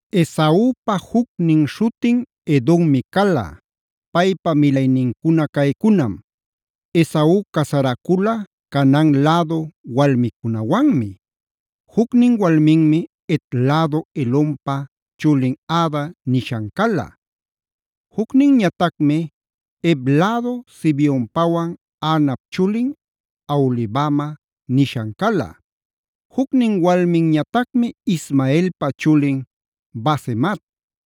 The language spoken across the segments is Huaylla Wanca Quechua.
Esaupa jucnin śhutin Edommi cala. Paypa milaynincuna caycunam: Esau casaracula Canaan lädu walmicunawanmi.a Jucnin walminmi Het lädu Elonpa chulin Ada nishan cala. Jucninñatacmi Hev lädu Zibeonpawan Anap chulin Aholibama nishan cala. Jucnin walminñatacmi Ismaelpa chulin Basemat;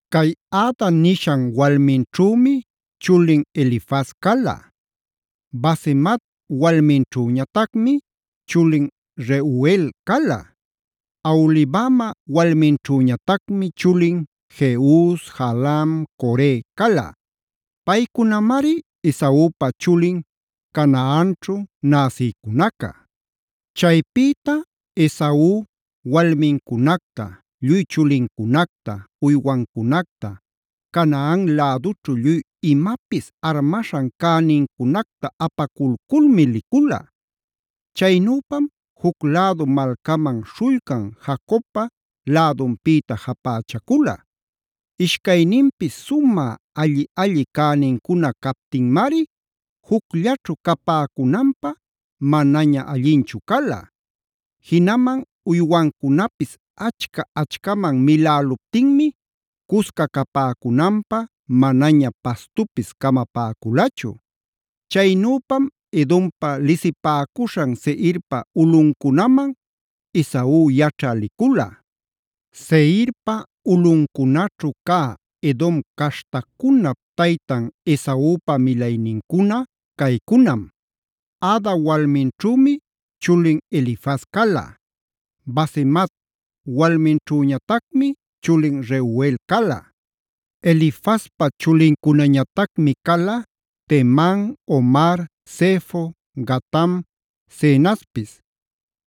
Cay Ada nishan walminćhümi chulin Elifaz cala. Basemat walminćhüñatacmi chulin Reuel cala. Aholibama walminćhüñatacmi chulin: Jeus, Jaalam, Core cala. Paycunamari Esaupa chulin Canaanćhu näsïcunaca. Chaypïta Esau walmincunacta, lluy chulincunacta, uywancunacta, Canaan lädućhu lluy imapis armaśhan cänincunacta apaculculmi licula. Chaynüpam juc lädu malcaman śhullcan Jacobpa lädunpïta japächacula. Ishcayninpis sumä alli-alli cänincuna captinmari jucllaćhu capäcunanpä manaña allinchu cala. Jinaman uywancunapis achca-achcaman miläluptinmi cusca capäcunanpä manaña pastupis camapäculachu. Chaynüpam Edompa lisipäcuśhan Seirpa ulꞌuncunaman Esau yaćhä licula. Seirpa ulꞌuncunaćhu cä Edom caśhtacunap taytan Esaupa milaynincuna caycunam: Ada walminćhümi chulin Elifaz cala. Basemat walminćhüñatacmi chulin Reuel cala. Elifazpa chulincunañatacmi cala: Teman, Omar, Zefo, Gatam, Cenazpis.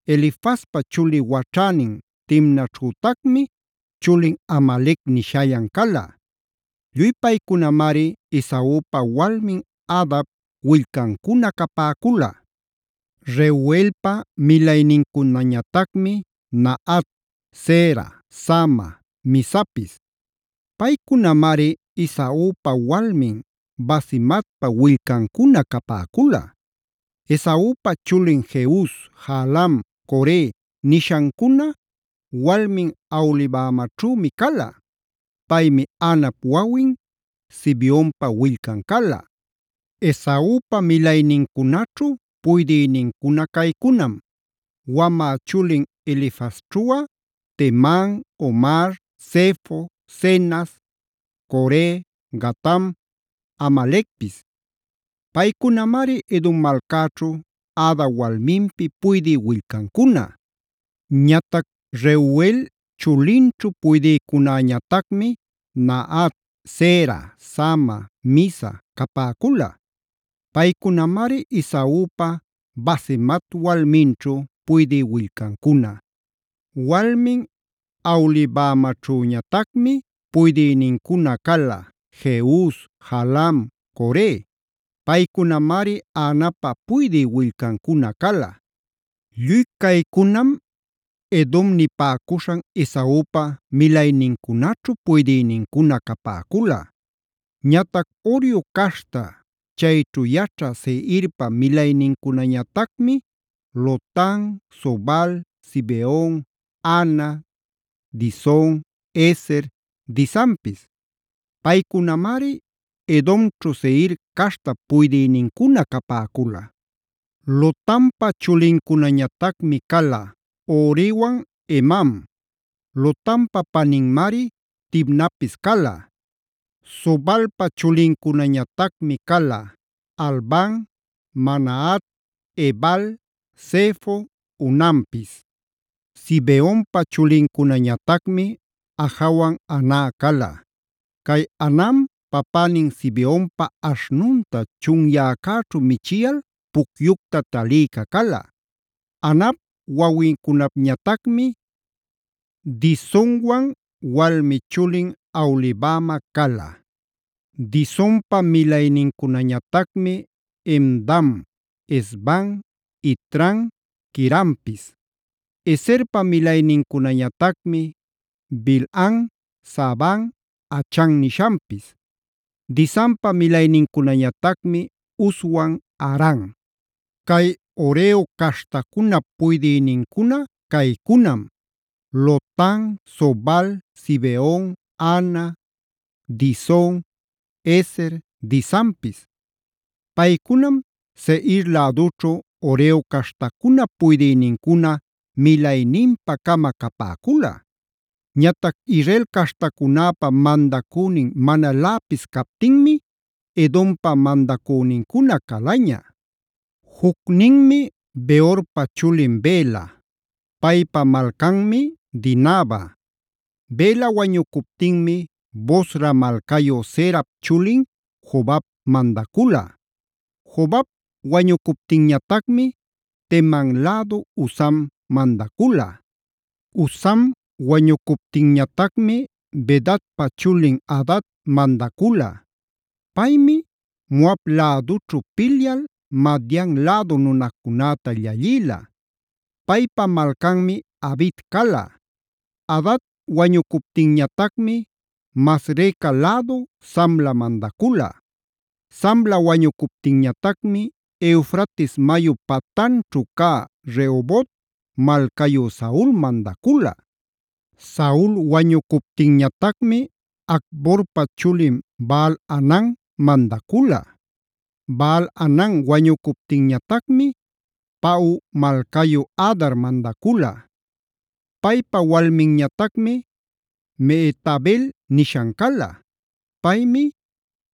Elifazpa chuli waćhänin Timnaćhütacmi chulin Amalec nishallan cala. Lluy paycunamari Esaupa walmin Adap willcancuna capäcula. Reuelpa milaynincunañatacmi: Nahat, Zera, Sama, Mizapis. Paycunamari Esaupa walmin Basematpa willcancuna capäcula. Esaupa chulin Jeus, Jaalam, Core nishancuna walmin Aholibamaćhümi cala. Paymi Anap wawin, Zibeonpa willcan cala. Esaupa milaynincunaćhu puydïnincuna caycunam; wamä chulin Elifazćhuꞌa: Teman, Omar, Zefo, Cenaz, Core, Gatam, Amalecpis. Paycunamari Edom malcäćhu Ada walminpi puydï willcancuna. Ñatac Reuel chulinćhu puydïcunäñatacmi: Nahat, Zera, Sama, Miza capäcula. Paycunamari Esaupa Basemat walminćhu puydï willcancuna. Walmin Aholibamaćhüñatacmi puydïnincuna cala: Jeus, Jaalam, Core. Paycunamari Anapa puydï willcancuna cala. Lluy caycunam Edom nipäcuśhan Esaupa milaynincunaćhu puydïnincuna capäcula. Ñatac Horeo caśhta chayćhu yaćhä Seirpa milaynincunañatacmi: Lotan, Sobal, Zibeon, Ana, Dison, Ezer, Disanpis. Paycunamari Edomćhu Seir caśhtap puydïnincuna capäcula. Lotanpa chulincunañatacmi cala: Horiwan, Hemam. Lotanpa paninmari Timnapis cala. Sobalpa chulincunañatacmi cala: Alvan, Manahat, Ebal, Sefo, Onampis. Zibeonpa chulincunañatacmi: Ajawan Ana cala. Cay Anam papänin Zibeonpa aśhnunta chunyäcäćhu michiyal pucyucta talïca cala. Anap wawincunapñatacmi: Disonwan walmi chulin Aholibama cala. Disonpa milaynincunañatacmi: Hemdam, Esban, Itran, Queranpis. Ezerpa milaynincunañatacmi: Bilhan, Zaavan, Achan nishanpis. Disanpa milaynincunañatacmi Uzwan Aran. Cay Horeo caśhtacunap puydïnincuna caycunam: Lotan, Sobal, Zibeon, Ana, Dison, Ezer, Disanpis. Paycunam Seir lädućhu Horeo caśhtacunap puydïnincuna milayninpa-cama capäcula. Ñatac Israel caśhtacunäpa mandacünin manaläpis captinmi Edompa mandacünincuna calaña: Jucninmi Beorpa chulin Bela; paypa malcanmi Dinaba. Bela wañucuptinmi Bosra malcayu Zerap chulin Jobab mandacula. Jobab wañucuptinñatacmi Teman lädu Husam mandacula. Husam wañucuptinñatacmi Bedadpa chulin Hadad mandacula. Paymi Moab lädućhu pilyal Madian lädu nunacunäta llallïla. Paypa malcanmi Avit cala. Hadad wañucuptinñatacmi Masreca lädu Samla mandacula. Samla wañucuptinñatacmi Eufrates mayu patanćhu cä Rehobot malcayu Saul mandacula. Saul wañucuptinñatacmi Acborpa chulin Baal-hanan mandacula. Baal-hanan wañucuptinñatacmi Pau malcayu Hadar mandacula. Paypa walminñatacmi Mehetabel nishan cala. Paymi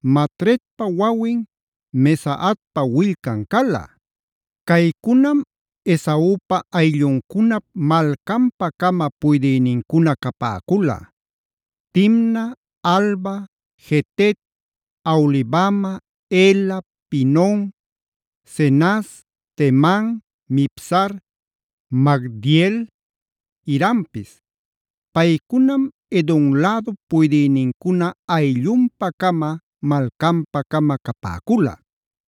Matredpa wawin, Mezaabpa willcan cala. Caycunam Esaupa aylluncunap malcanpa-cama puydïnincuna capäcula: Timna, Alva, Jetet, Aholibama, Ela, Pinon, Cenaz, Teman, Mibzar, Magdiel, Irampis. Paycunam Edom lädup puydïnincuna ayllunpa-cama, malcanpa-cama capäcula.